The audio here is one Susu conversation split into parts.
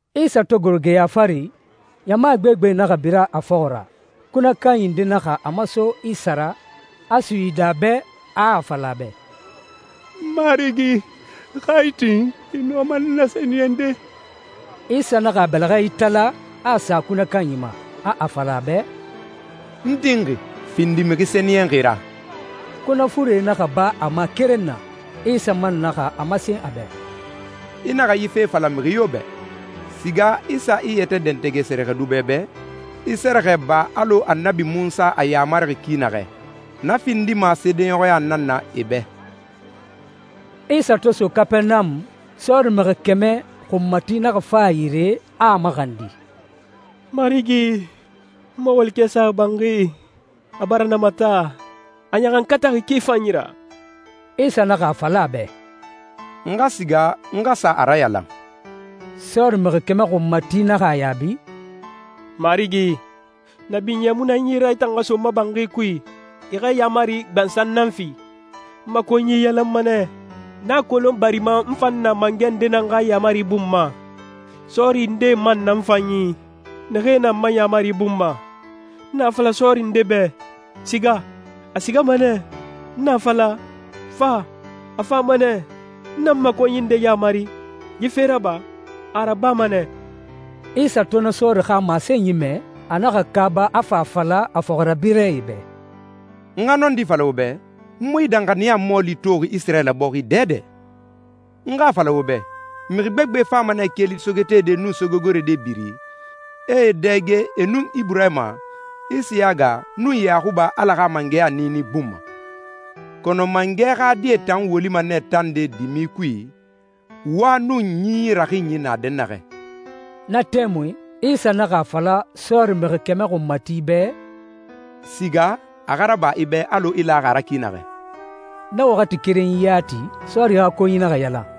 Isa to goro geya fari, ɲama gbegbe naxa bira a fɔxɔ ra. Kunɛ kanyi nde naxa a maso Isa ra, a suyidi a bɛ, a a fala a bɛ, «N Marigi, xa i tin, i nɔma n nasɛniyɛnde.» Isa naxa a bɛlɛxɛ itala, a a sa kunɛ kanyi ma, a a fala a bɛ, «N tinxi. Findi mixi sɛniyɛnxi ra.» Kunɛ fure naxa ba a ma keren na. Isa man naxa a masen a bɛ, «I naxa yi fe fala mixi yo bɛ. Siga i sa i yɛtɛ dɛntɛgɛ sɛrɛxɛdubɛ bɛ, i sɛrɛxɛ ba alɔ Annabi Munsa a yamarixi ki naxɛ. Na findima seedeɲɔxɔya nan na e bɛ.» Isa to so Kapɛrɛnamu, sɔɔri mixi kɛmɛ xunmati naxa fa a yire, a a maxandi, «Marigi, n ma walikɛ saxi banxi, a bara namata, a ɲaxankataxi ki fanyi ra.» Isa naxa a fala a bɛ, «N xa siga, n xa sa a rayalan.» Sɔɔri mixi kɛmɛ xunmati naxa a yaabi, «Marigi, na binyɛ mu na n yi ra i tan xa so n ma banxi kui. I xa yaamari gbansan nan fi, n ma konyi yalanma nɛ. N a kolon barima n fan na mangɛ ndee nan xa yaamari bun ma, sɔɔri ndee man na n fan yi, naxee na n ma yaamari bun ma. N na a fala sɔɔri nde bɛ, ‹Siga,› a sigama nɛ. N na a fala, ‹Fa,› a fama nɛ. N na n ma konyi nde yamari, ‹Yi fe raba,› a a rabama nɛ.» Isa to na sɔɔri xa masenyi mɛ, a naxa kaaba, a fa a fala a fɔxirabirɛe bɛ, «N xa nɔndi fala wo bɛ, n mu yi danxaniya mɔɔli toxi Isirayila bɔxi dɛdɛ. N xa a fala wo bɛ, mixi gbegbe fama nɛ keli sogetede nun sogegorode biri, e e dɛge e nun Iburahima, Isiyaga, nun Yaxuba Ala xa mangɛya niini bun ma. Kɔnɔ mangɛ xa die tan wolima nɛ tande dimi kui, wa nun ɲinyi raxinyi na dɛnnaxɛ.» Na tɛmui Isa naxa a fala sɔɔri mixi kɛmɛ xunmati bɛ, «Siga, a xa raba i bɛ alɔ i laxi a ra ki naxɛ.» Na waxati kerenyi yati, sɔɔri xa konyi naxa yalan.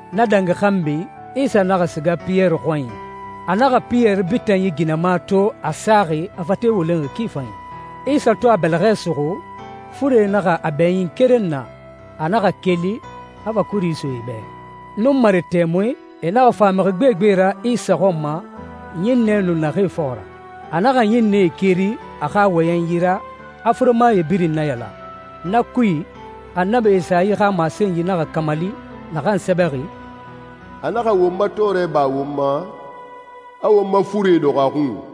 Na dangi xanbi, Isa naxa siga Piyɛri xɔnyi. A naxa Piyɛri bitanyi ginɛma to, a saxi, a fate wolenxi ki fanyi. Isa to a bɛlɛxɛ suxu, fure naxa a bɛɲin keren na. A naxa keli, a fa kuri so e bɛ. Nunmare tɛmui, e naxa fa mixi gbegbe ra Isa xɔn ma ɲinnɛ nu naxee fɔxɔ ra. A naxa ɲinnɛe keri a xa wɔyɛnyi ra, a furemae birin nayalan. Na kui, Annabi Esayi xa masenyi naxa kamali, naxan sɛbɛxi, «A naxa won ma tɔɔrɛ ba won ma, a won ma furee dɔxɔ a xun.»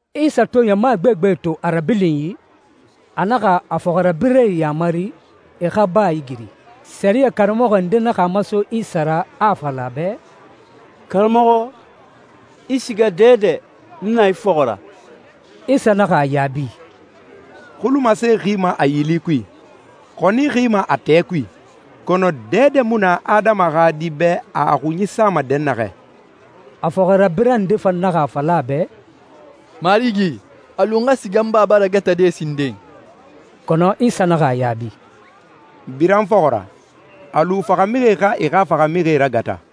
Isa to ɲama gbegbe to a rabilinyi, a naxa a fɔxirabirɛe yamari e xa baa igiri. Sɛriyɛ karamɔxɔ nde naxa a maso Isa ra, a a fala a bɛ, «Karamɔxɔ, i siga dɛdɛ, n na i fɔxɔ ra.» Isa naxa a yaabi, «Xulumase xima a yili kui. Xɔni xima a tɛɛ kui. Kɔnɔ dɛdɛ mu na Adama xa Di bɛ a a xunyi sama dɛnnaxɛ.» A fɔxirabirɛ nde fan naxa a fala a bɛ, «Marigi, a lu n xa siga n baba ragatade sinden.» Kɔnɔ Isa naxa a yaabi, «Bira n fɔxɔ ra. A lu faxamixie xa e xa faxamixie ragata.»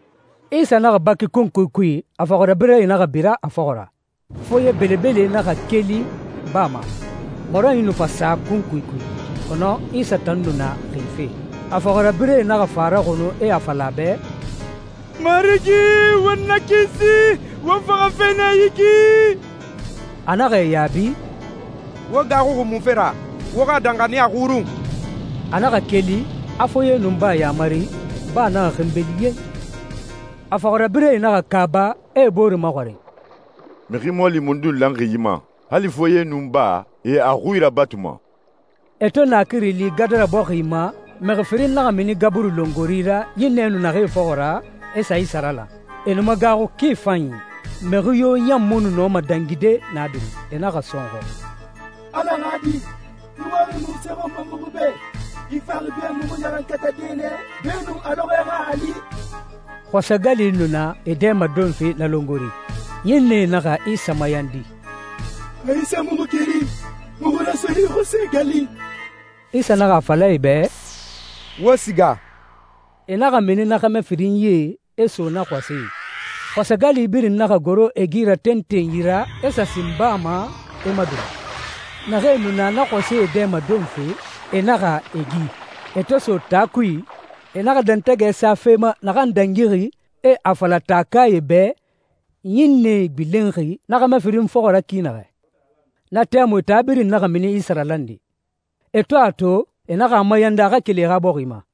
Isa naxa baki kunkui kui, a fɔxirabirɛe naxa bira a fɔxɔ ra. Foye belebele naxa keli baa ma, mɔrɔnyi nu fa sa kunkui kui. Kɔnɔ Isa tan nu na xife. A fɔxirabirɛe naxa fa a raxunu, e a fala a bɛ, «Marigi, won nakisi, won faxafe nɛ yi ki!» A naxa e yaabi, «Wo gaaxuxi munfe ra? Wo xa danxaniya xurun!» A naxa keli, a foye nun baa yamari, baa naxa xinbeli yen! A fɔxirabirɛe naxa kaaba, e e bore maxɔrin, «Mixi mɔɔli mundun lanxi yi ma? Hali foye nun baa, e a xui rabatuma.» E to naakiri li Gadara bɔxi ma, mixi firin naxa mini gaburi longori ra ɲinnɛe nu naxee fɔxɔ ra, e sa Isa ralan. E nu magaaxu ki fanyi, mixi yo ɲan mu nu nɔma dangide na biri. E naxa sɔnxɔ, «Ala xa Di, i waxi munse xɔn ma muxu bɛ? I faxi be muxu ɲaxankatade nɛ beenun a lɔxɔɛ xa a li?» Xɔsɛ gali nu na e dɛmadonfe na longori. Ɲinnɛe naxa Isa mayandi, «Xa i sa muxu keri, muxu raso yi xɔsɛ gali.» Isa naxa a fala e bɛ, «Wo siga.» E naxa mini na xɛmɛ firinyie, e so na xɔsɛe i. Xɔsɛ gali birin naxa goro e gi ra tentenyi ra, e sa sin baa ma, e madula. Naxee nu na xɔsɛe dɛmadonfe, e naxa e gi. E to so taa kui, e naxa dɛntɛgɛ sa fe ma naxan dangixi, e a fala taakae bɛ ɲinnɛe gbilenxi na xɛmɛ firin fɔxɔ ra ki naxɛ. Na tɛmui taa birin naxa mini Isa ralande. E to a to, e naxa a mayandi a xa keli e xa bɔxi ma.